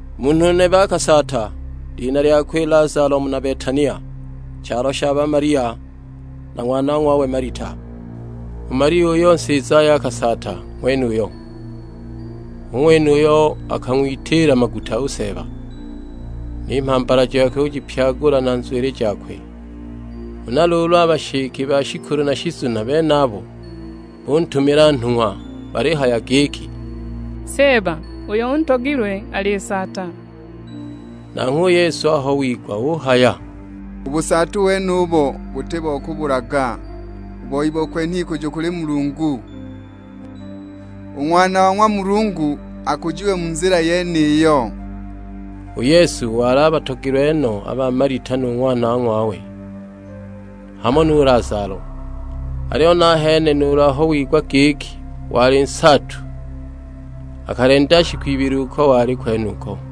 Munhu nebe akasaata, lina lyakwe Lazalo muna Betania, chalo sha ba Malia na ng'wanong'wawe Malita. U Malia uyo nsizaye akasaata ng'wenuyo, hu ng'wene uyo akang'witiila maguta u Seeba, ni mhambala jakwe ujipyagula na nzwili jakwe. Huna luulu a bashike ba shikulu na shizuna benabo buntumila nhung'wa balihaya giki, "Seeba, uyo untogilwe alisaata!" Nanghwe u Yesu aho wigwa uhaya, "U busaatu wenubo buti bo kubulaga, u boi bo kwenha ikujo kuli Mulungu: u Ng'wana wa ng'wa Mulungu akujiwe mu nzila yeniyo." U Yesu wali abatogilwe no a ba Malita nu ng'wanong'wawe, hamo nu Lazalo. Aliyo nahene nuulu aho wigwa giki wali nsaatu akalenda shiku ibili uko wali kwenuko.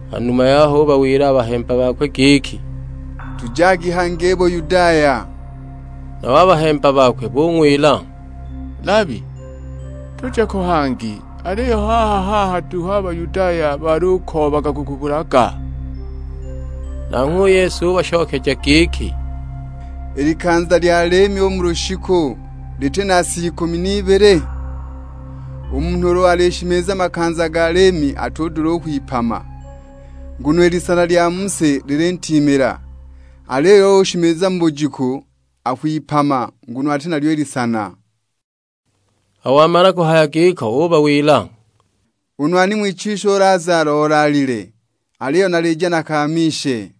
Ha numa yaho ubawila a bahemba bakwe giki, "Tujagi hangi i Buyudaya." Nabo a bahemba bakwe bung'wila, "Labi, tuje ko hangi aliyo haaha-haaha duhu a Bayudaya balukoobaga kukubulaga?" Nanghwe u Yesu ubashokeja giki, "I likanza lya liimi u mu lushiku, liti na sa ikumi n'ibili? U munhu ulu alishimiza makanza ga liimi atudula u kwipama, nguno i lisana lya mu si lilintiimila. Aliyo ulu ushimiza bujiku, akwipama nguno ati nalyo i lisana." Aho wamala kuhaya giko ubawila, "U nwani ng'wichiswi u Lazalo olaalile, aliyo nalija nakaamishe."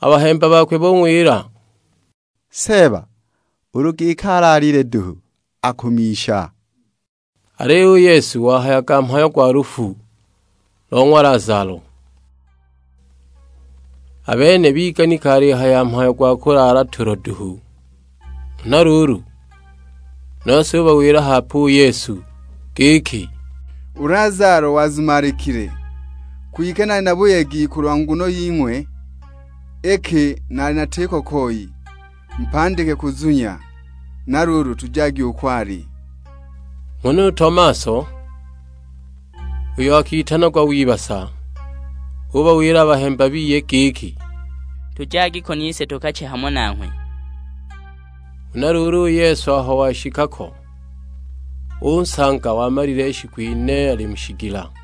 A bahemba bakwe bung'wila, "Seeba, ulu giki alaalile duhu, akumisha." Aliyo u Yesu wahayaga mhayo gwa lufu lo ng'wa Lazalo; a bene biganika alihaya mhayo gwa kulaala tulo duhu. Huna luulu, nose ubawila hape u Yesu; giki, "U Lazalo wazumalikile! Kwike nali na buyegi kulwa nguno ying'we, iki naali natiko koi; mupandike kuzunya. Na luulu tujagi uko ali!" Huna u Tomaso, uyo akitanagwa w'ibasa, ubawila a bahemba biye giki, "Tujagi ko nise tukache hamo nanghwe!" Huna luulu u Yesu aho washika ko, unsanga wamalile shiku ine ali mu shigila.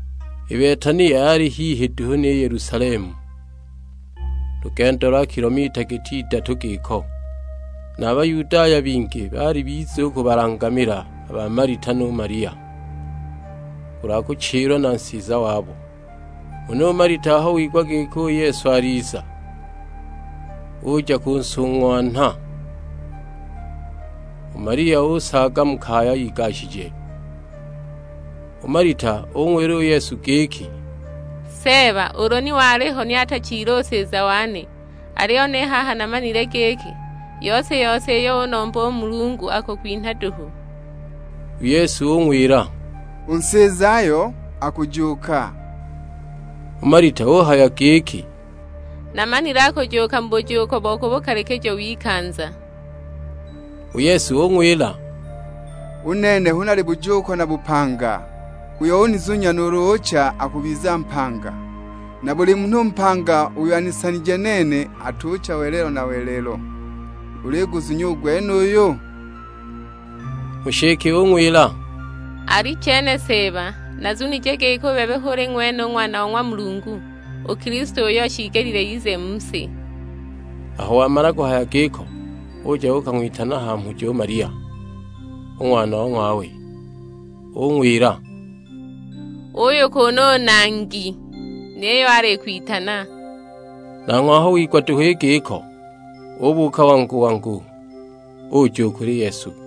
I Betania yali hihi duhu ni Yelusalemu, lugendo lwa kilomita giti idatu giko. Na Bayudaya bingi baali biza u kubalangamila a ba Malita nu Malia, kulwa kuchilwa na nsiza wabo. Huna u Malita aho wigwa giki u Yesu aliza, uja kunsung'wanha; u Malia usaaga mu kaya igashije. U Malita ung'wila u Yesu giki, "Seeba, ulu ni waliho ni atachile u nsiza wane. Aliyo ni haha namanile giki, yose-yose iyo unomba u Mulungu akukwinha duhu!" U Yesu ung'wila, "U nsizayo akujuuka." U Malita uhaya giki, "Namanile akujuuka mu bujuuko bo ku bukalikijo w'ikanza!" U Yesu ung'wila, "U Nene hu nali Bujuuko na Bupanga, uyo unizunya nuulu ucha akubiza mpanga. Na buli munhu mpanga uyo anisanije nene atucha welelo na welelo. Uliguzunya u gwenuyu?" U nshike ung'wila, "Alichene Seeba, nazunije giki u bebe hu uli ng'wene u Ng'wana wa ng'wa Mulungu; u Kilisto uyo shiigelile ize mu si!" Aho wamala kuhaya giko uja uukang'witana ha mhujo u Malia, u ng'wanong'wawe: ung'wila, "Uuyu kuunu u Nangi, niyo alikwitana!" Nanghwe aho wigwa duhu i giko ubuuka wangu-wangu, uja u kuli Yesu.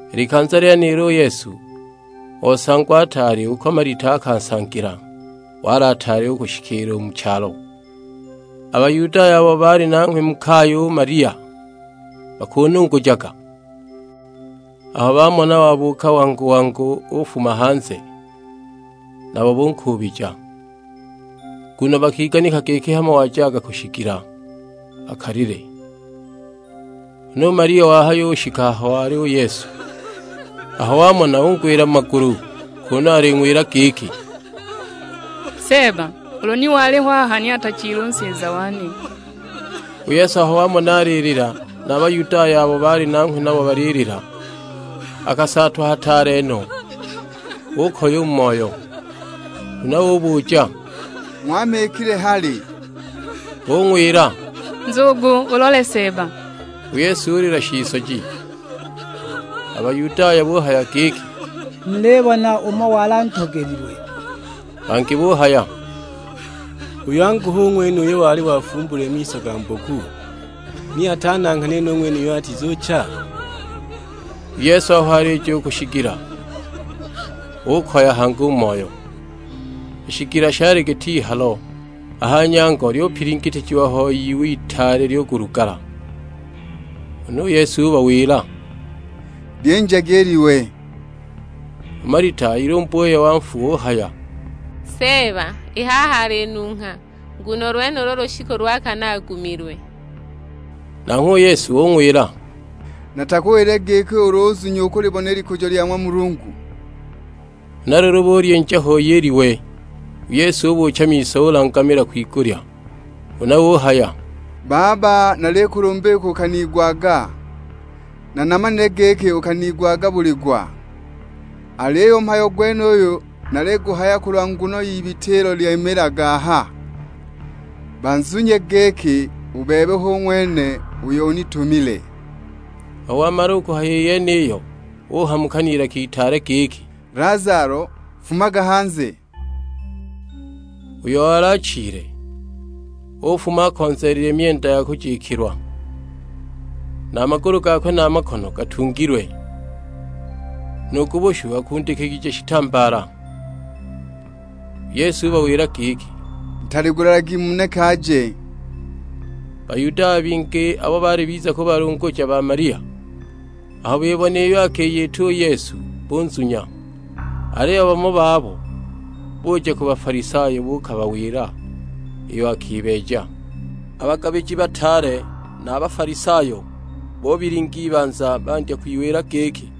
I likanza lyenilo u Yesu osangwa ataali uko Malita akansangila, wali ataali u kushikiila u mu chalo. A Bayudaya abo baali nanghwe mu kaya u Malia bakunungujaga, aho bamona wabuuka wangu-wangu ufuma hanze, nabo bunkuubija; nguno bakiganika giki hamo wajaga ku shigila akalile. Huna u Malia wahayushika aho wali u Yesu, aho wamona ungwila mu magulu, kunu aling'wila giki, "Seeba, ulu ni waliho aha ni atachile u nsiza wane!" U Yesu aho wamona alilila na a Bayudaya abo baali nanghwe nabo balilila, akasaatwa hataale no, ukoya u mu moyo. Huna ubuja, "Ng'wamikile hali?" Bung'wila, "Nzugu ulole Seeba!" U Yesu ulila shisoji! A Bayudaya buhaya giki, "Mulibona umo wali antogelilwe!" Bangi buhaya, "Uyu angu hu ng'wene uyo wali wafumbulile miso ga mboku, ni atananghanile nu ng'wenuyo atizucha?" U Yesu aho alija u ku shigila ukoya hangi u mu moyo. I shigila shali git'ihalo; a ha nyango lyupilingitijiwa hoi iwe itaale lyulugala. Huna u Yesu ubawila, "Lyinjagi i liwe!" U Malita u ilumbuye wa nfu uhaya, "Seeba, i haha alinungha, nguno u lwenulu lushiku lwa kane agumilwe!" Nanghwe u Yesu ung'wila, "Natakuwilile giki ulu uzunya ukulibona i likujo lya ng'wa Mulungu?" Huna luulu bulyinja ho i liwe. U Yesu ubuucha miso ulangamila kwigulya; huna uhaya, "Baba, nalikulumba iki ukaniigwaga. Na namanile giki ukaniigwaga buli gwa, aliyo u mhayo gwenuyu naliguhaya kulwa nguno y'ibita ilo lyimiilaga aha; bazunye giki, u Bebe hu ng'wene uyo unitumile." Aho wamala u kuhaya i yeniyo, uhamuka n'ilaka itaale giki, "Lazalo, fumaga hanze!" Uyo wali achile ufuma akonzeelile myenda ya kujikilwa, na a magulu gakwe na a makono gatungilwe; nu ku bushu akundikijiwe shitambaala. U Yesu ubawila giki, "Ntaligulilagi muneke aje." Bayudaya bingi abo baali biza kubalunguja ba Malia, aho bibona iyo akiyita u Yesu, bunzunya. Aliyo bamo babo buja ku Bafalisayo buukabawila iyo akibeeja. A bagabiji bataale na a Bafalisayo bubilinga ibanza, bandya kwiwila giki,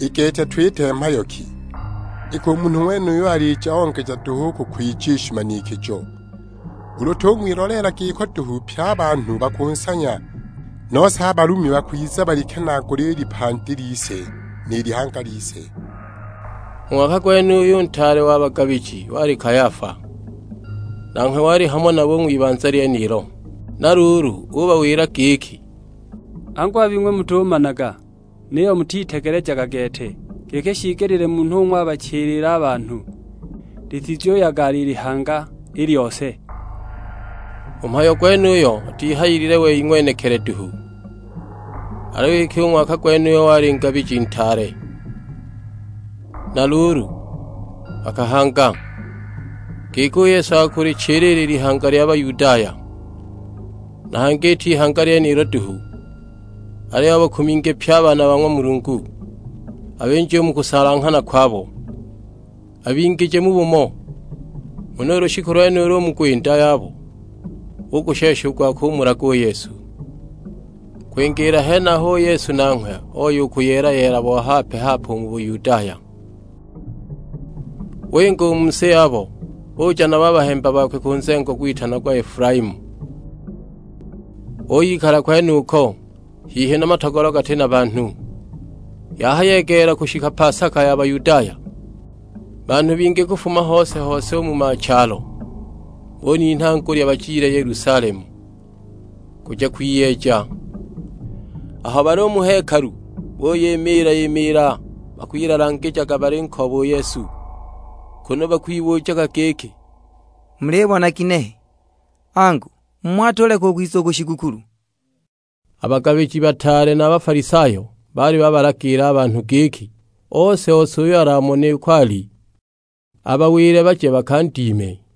"I gete twite mhayo ki? Iki u munhu ng'wenuyu alija ongeja duhu u kukwija i shimanikijo! Ulu tung'wiloleela giko duhu pye a banhu bakunsanya, nose a Balumi bakwiza balikenaagule i lipandi lise, ni lihanga lise!" U ng'waka gwenuyo u ntaale wa bagabiji wali Kayafa; nanghwe wali hamo nabo u ng'wibanza lyenilo. Na luulu ubawila giki, "Angu a bing'we mutumanaga, niyo mutitegelejaga gete, giki shiigelile munhu umo abachilile a banhu; litizuyagala i lihanga i lyose!" U mhayo gwenuyo atihayilile wei ng'wenekili duhu, aliyo iki u ng'waka gwenuyo wali ngabiji ntaale. Na luulu akahanga, giki u Yesu akulichilila i lihanga lya Bayudaya. Na hangi iti ihanga lyenilo duhu, aliyo abakuminge pye a baana ba ng'wa Mulungu, abinje u mu kusalanghana kwabo, abingije mu bumo. Huna u lushiku lwenulo u mu gwinda yabo bugushesha u gwa kumulaga u Yesu. Kwingiila henaho u Yesu nanghwe oya u kuyeela bo hape-hape u mu Bayudaya; winga u mu si yabo uja nabo a bahemba bakwe ku nzengo gwitanagwa Efulaimu, uyikala kwenuko; hihi na matogolo gati na banhu. Yahayegeela kushika pasaka ya Bayudaya, banhu bingi kufuma hose-hose u mu machalo bulinha ngulya bajile Yelusalemu, kuja kwiyeeja. Aho bali u mu hekalu buyimiila-imiila bakwilalangijaga balinkooba u Yesu, kunu bakwibujaga giki, "Mulibona ginehe, angu mmho atuleka u kwiza u ku shigukulu?" A bagabiji bataale na a Bafalisayo baali babalagila a banhu giki ose-ose uyo alamone uko ali, abawile baje bakandime.